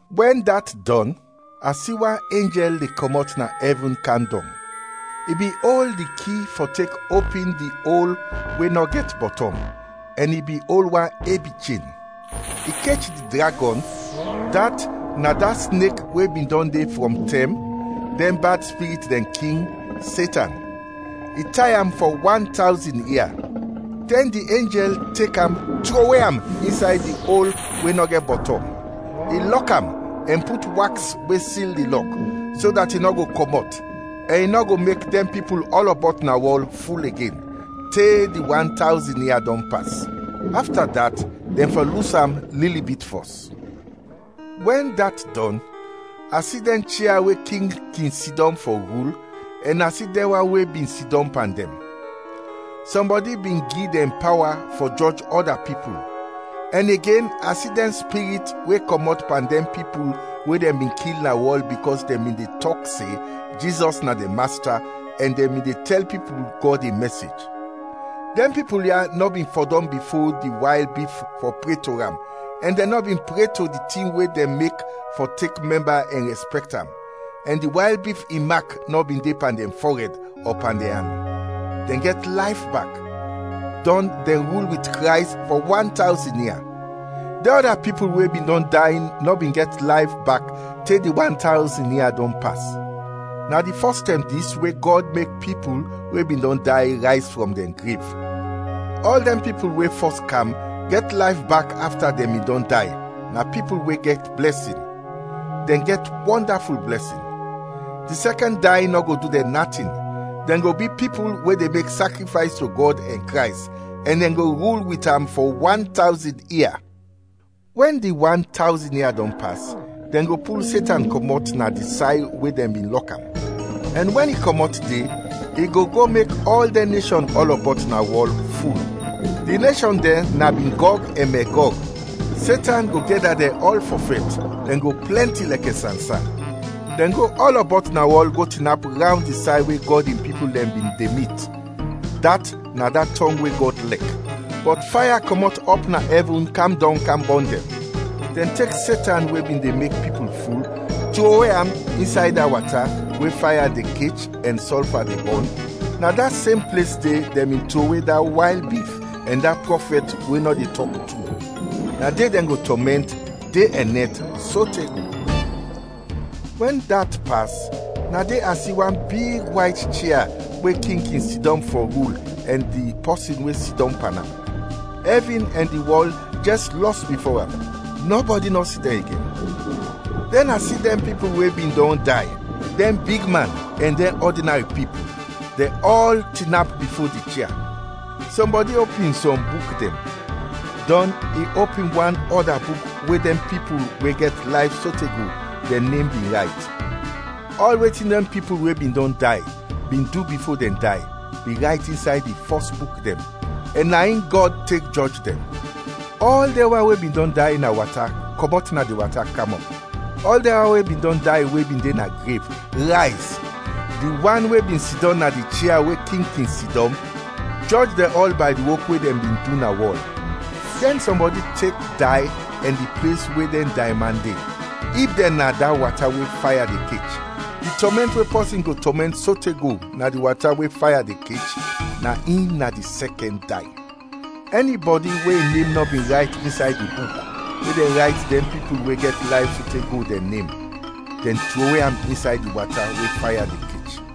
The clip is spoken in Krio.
Wɛn dat dɔn, a si wan enjɛl de kɔmɔt na ɛvin kam dɔng. I bin ol di ki fɔ tek opin di ol we nɔ gɛt bɔtɔm, ɛn i bin ol wan ebi chen. I kech di dragɔn, dat na da snek we bin dɔn de frɔm tɛm, dɛn bad spirit dɛn king, Setan; i tay am fɔ wan tawzin ia. Dɛn di enjɛl tek am trowe am insay di ol we nɔ gɛt bɔtɔm, i lɔk am ɛn put waks we sil di lɔk, so dat i nɔ go kɔmɔt, ɛn i nɔ go mek dɛn pipul ɔlɔbɔt na wɔl ful igen, te di wan tawzin ia dɔn pas. Afta dat, dɛn fɔ lus am lili bit fɔs. Wɛn dat dɔn, a si dɛn chia we king kin sidɔm fɔ rul, ɛn a si dɛn wan we bin sidɔm pan dɛn. Sɔmbɔdi bin gi dɛn pawa fɔ jɔj ɔda pipul, ɛn igen a si dɛn spirit we kɔmɔt pan dɛn pipul we dɛn bin kil na wɔl bikɔs dɛn bin de tɔk se Jizɔs na dɛn Masta ɛn dɛn bin de tɛl pipul Gɔd in mɛsej. Dɛn pipul ya nɔ bin fɔdɔm bifo di wayl bif fɔ pre to am ɛn dɛn nɔ bin pre to di tin we dɛn mek fɔ tek mɛmba ɛn rɛspɛkt am, ɛn di wayl bif in mak nɔ bin de pan dɛn fɔrɛd ɔ pan dɛn an. Dɛn gɛt layf bak, dɔn dɛn rul wit Krays fɔ wan tawzin ia. Dɛn ɔda pipul we bin dɔn day nɔ bin gɛt layf bak te di wan tawzin ia dɔn pas. Na di fɔs tɛm dis we Gɔd mek pipul we bin dɔn day rayz frɔm dɛn grev. Ɔl dɛn pipul we fɔs kam gɛt layf bak afta dɛn bin dɔn day na pipul we gɛt blɛsin, dɛn gɛt wɔndaful blɛsin. Di sɛkɛn day nɔ go du dɛn natin; dɛn go bi pipul we de mek sakrifays to Gɔd ɛn Krays, ɛn dɛn go rul wit am fɔ wan tawzin ia. Wɛn di wan tawzin ia dɔn pas, dɛn go pul Setan kɔmɔt na di say we dɛn bin lɔk am, ɛn wɛn i kɔmɔt de, i go go mek ɔl dɛn neshɔn ɔlɔbɔt na wɔl, ful. Di neshɔn dɛn na bin Gɔg ɛn Megɔg. Setan go gɛda dɛn ɔl fɔ fɛt; dɛn go plɛnti lɛkɛ sansan. Dɛn go ɔlɔbɔt na wɔl go tinap rawnd di say we Gɔd in pipul dɛn bin de mit, dat na da tɔng we Gɔd lɛk. Bɔt faya kɔmɔt ɔp na ɛvin kam dɔng kam bɔn dɛn. Dɛn tek Setan we bin de mek pipul ful, trowe am insay da wata we faya de kech ɛn sɔlfa de bɔn; na da sem ples de dɛn bin trowe da wayl bif ɛn da prɔfɛt we nɔ de tɔk tru; na de dɛn go tɔmɛnt, de ɛn nɛt, sote go. Wɛn dat pas, na de a si wan big wayt chia we king kin sidɔm fɔ rul ɛn di pɔsin we sidɔm pan am. Ɛvin ɛn di wɔl jɛs lɔs bifo am; nɔbɔdi nɔ si dɛn igen. Dɛn a si dɛn pipul we bin dɔn day, dɛn bigman ɛn dɛn ɔdinari pipul, dɛn ɔl tinap bifo di chia. Sɔmbɔdi opin sɔm buk dɛn, dɔn i opin wan ɔda buk we dɛn pipul we gɛt layf sote go dɛn nem bin rayt. Ɔl wetin dɛn pipul we bin dɔn day bin du bifo dɛn day, bin rayt insay di fɔs buk dɛn, ɛn na in Gɔd tek jɔj dɛn. Ɔl dɛn wan we bin dɔn day na wata kɔmɔt na di wata kam ɔp; ɔl dɛn wan we bin dɔn day we bin de na grev, rayz; di wan we bin sidɔm na di chia we king kin sidɔm, jɔj dɛn ɔl bay di wok we dɛn bin du na wɔl. Dɛn sɔmbɔdi tek day ɛn di ples we dɛn dayman de, ib dɛn na da wata we faya de kech. (Di tɔmɛnt we pɔsin go tɔmɛnt sote go na di wata we faya de kech, na in na di sɛkɛn day.) Ɛnibɔdi we in nem nɔ bin rayt insay di buk we dɛn rayt dɛn pipul we gɛt layf sote go dɛn nem, dɛn trowe am insay di wata we faya de kech.